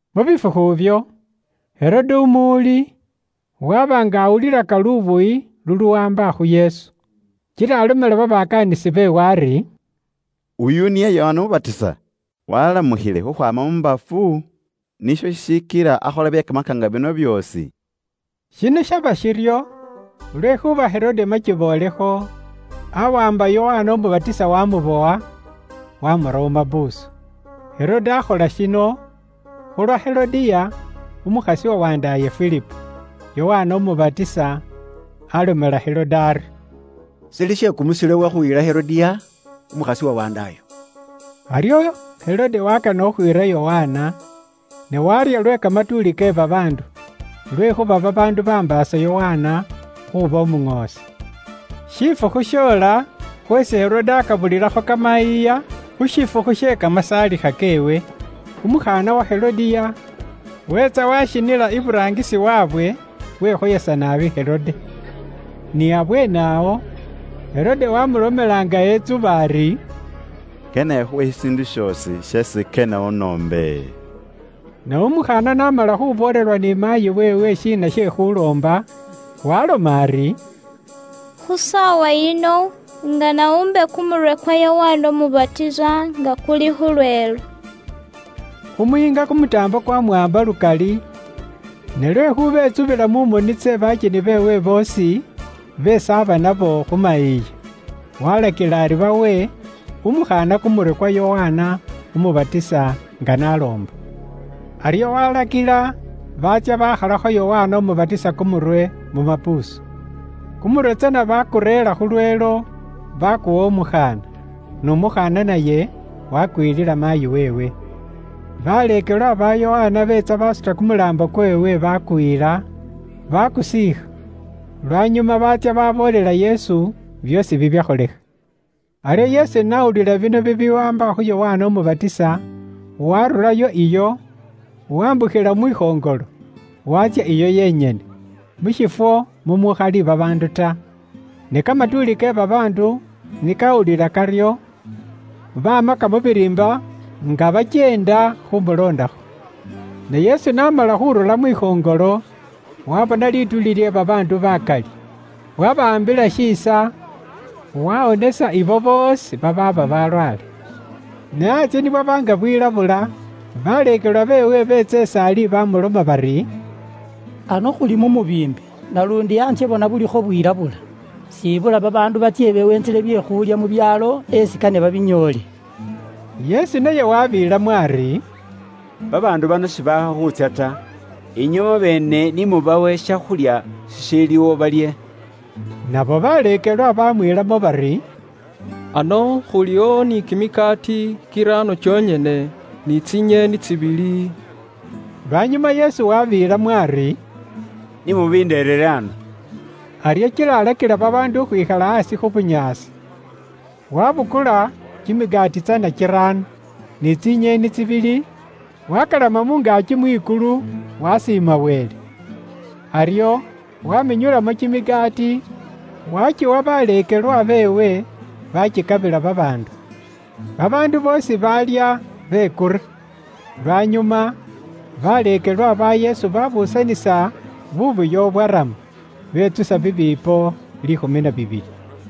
Mu bifukhu ibyo, Herode umuwuli, waaba nga awulilaka lubuyi luluwaamba khu Yesu. Kila alomela babakaanisi beewe ari, “Oyu niye Yokana Umubatisa! Waalamukhile khukhwaama mu bafu, nisho shishikila akhola bye kamakaanga bino byoosi.” Shino shaba shiryo lwekhuuba Herode makiboolekho, awaamba Yokana Umubatisa wamubowa, wamura mu mapuusu. Herode akhola shino khu lwa Herodiya, umukhasi wa wandaaye Filipo. Yokana Umubatisa alomela Herode ari, “Shili she kumusilo iwe khuyila Herodiya, umukhasi wa wandaayo.” Aryo Herode wakana khukhwiira Yokana, ne warya lwe kamatuuli ke babaandu, lwekhuuba babaandu bambaasa Yokana khuuba umuŋoosi. Shifukhu shoola khweesi Herode akabulilakho kamayiiya khu shifukhu she kamasaalikha keewe. Umukhaana wa Herodiya weetsa washinila iburaangisi waabwe, wekhoyesa naabi Herode. Ni abweene awo, Herode wamulomela nga etsuba ari, “Kane ikhuwe shishiindu shoosi sheesi kane unoombe.” Ne umukhaana n'amala khuboolelwa ni maayi weewe shiina she khuloomba, waaloma ari, “Khu saawa yino, ingana wumbe kumurwe kwa Yokana Umubatisa nga kuli khu lweelo.” Umuyiinga kumutaambo kwamuwaamba lukali, ne lwekhuuba etsubila mu moni tse bakyeni beewe boosi beesi aba nabo khu mayiiya, walakila ari bawe umukhaana kumurwe kwa Yokana Umubatisa nga n'aloomba. Aryo walakila baatsya bakhalakho Yokana Umubatisa kumurwe mu mapuusu. Kumurwe tsana bakureera khu lweelo, bakuwa umukhaana, n'umukhaana naye wakuyilila maayi weewe. Baleekelwa ba Yokana beetsa basuta kumulaambo kweewe, bakuyila, bakusiikha. Lwanyuma baatsya baboolela Yesu byoosi bibyakholekha. Aryo Yesu n'awulila bino bibiwaamba khu Yokana Umubatisa, waarurayo iyo, wambukhila mwikhoŋolo, waatsya iyo yenyene, mu shiifwo mumukhali babaandu ta. Ne kamatuuli ke babaandu ni kawulila karyo, bamaka mu biriimba nga bakyeenda khumuloondakho. Ne Yesu n'amala khurura mwikhoŋolo, waabona lituuli lye babaandu bakali, wabawaambila shiisa, wawonesa ibo boosi babaaba balwaale. Ne antsye ni bwaba nga bwilabula, baleekelwa beewe beetsa is'ali bamuloma bari, “Ano khuli mu mubiimbi, naluundi antsye bona bulikho bwilabula, siibula babaandu batsye beweentsele bye khulya mu byaalo esi kane babinyoole.” Yesu naye wabeelamo ari, “Babaandu bano sibaakha khuutsya ta. Inywe mwabeene ni mubawe shakhulya shishiiliwo balye.” Nabo baleekelwa bamwiilamo bari, “Ano khuliwo ni kimikaati kiraano kyonyene, ni tsinyeeni tsibili.” Lwanyuma Yesu wabeelamo ari, “Ni mubindereere ano.” Aryo kila alakila babaandu khukhwikhala aasi khu bunyaasi. Waabukula kimikaati tsana kiraano, ni tsinyeeni tsibili, waakalama mu ngaaki mwikulu, waasiima Wele. Aryo waamenyulamo kimikaati, waakiwa baleekelwa beewe, baakikabila babaandu. Babaandu boosi baalya, bekura. Lwanyuma baleekelwa ba Yesu baabuusanisa buubuya bubwarama, betsusa bibiipo liikhumi na bibili.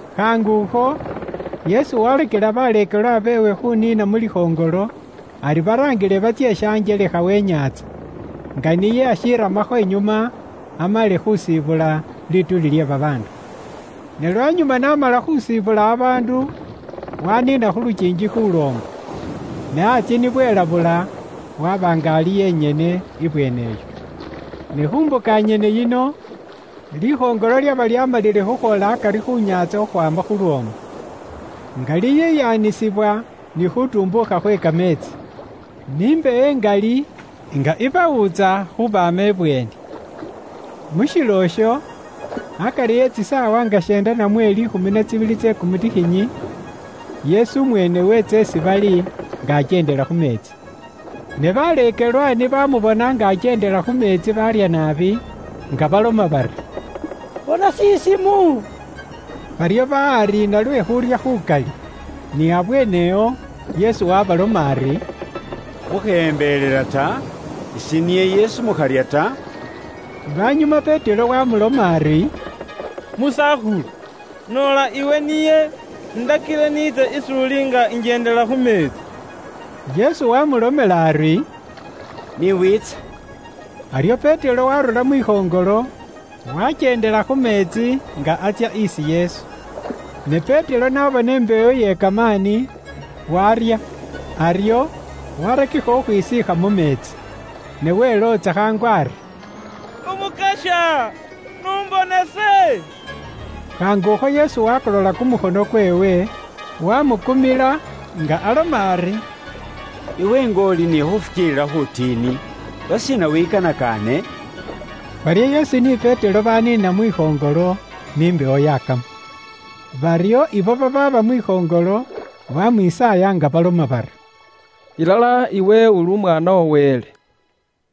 Khaangukho Yesu waalakila baleekelwa beewe khuuniina mu likhoŋolo, ari baraangile batsye shanjelekha we nyaantsa, nga niye n'ashiiramakho inyuma amale khusiibula lituuli lye babaandu. Ne lwanyuma n'amala khusiibula babaandu, waaniina khu lukiingi khuuloomba. Ne antsye ni bwelabula, waaba nga ali yenyene ibweene iyo. Ne khu mbuka nyene yino, likhoŋolo lyaba lyaamalile khukhwoola akari khu nyaantsa khukhwaama khu lwoomu, nga liyiyaanisibwa ni khuutumbuukha khwe kameetsi, ni mbewo ingali nga ibawuutsa khuubaama ibweeni. Mu shilo isho, akari e tsisaawa nga sheenda namwe liikhumi na tsibili tse kumutikhinyi, Yesu umweene weetsa isi bali nga akyeendela khu meetsi. Ne baleekelwa ni baamubona nga akyeendela khu meetsi baarya naabi, nga baloma bari, “Bona shisimu.” Baryo bahariina lwe khuurya khukali. Ni abweene awo, Yesu waabaloma ari, “Mukheyembelela ta. Ise niye Yesu. Mukharya ta.” Lwanyuma Petero wamuloma ari, “Musakhulu, noola iwe niye, indakile niitse is'uli nga injendela khu meetsi.” Yesu waamulomela ari, “Ni wiitse.” Aryo Petero waarura mwikhoŋolo, wakyeendela khu meetsi nga atsya isi Yesu. Ne Petero n'abona imbewo iye kamaani, waarya, aryo, waarakikha khukhwisiikha mu meetsi. Ne welootsa khaangu ari, “Umukasya, n'umbonese.” Khaangukho Yesu waakolola kumukhono kweewe, waamukumila, nga aloma ari, “Iwe nga uli ni khufukiilila khufwiiti. Lwashiina wikanakaane?” Baryo Yesu ni Petero baniina mwikhoŋolo, ni mbewo yakama. Baryo ibo babaaba mwikhoŋolo, bamwisaaya nga baloma bari, “Ilala iwe uli Umwaana wa Wele.”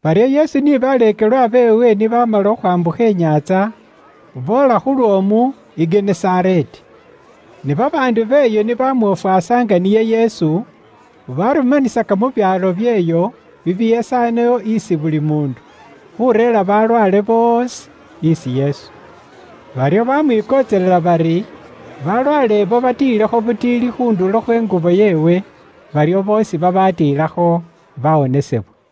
Baryo Yesu ni baleekelwa beewe ni baamala khukhwambukha inyaantsa, boola khu lwoomu i Genesareeti. Ne babaandu b'eyo ni bamwofwasa nga niye Yesu, barumanisaka mu byaalo byeeyo bibihesanewo isi buli muundu, khureera balwaale boosi isi Yesu. Baryo baamwikontselela bari balwaale abo batiilekho butiili khu ndulo khwe ngubo yeewe. Baryo boosi babaatiilakho baawonesebwa.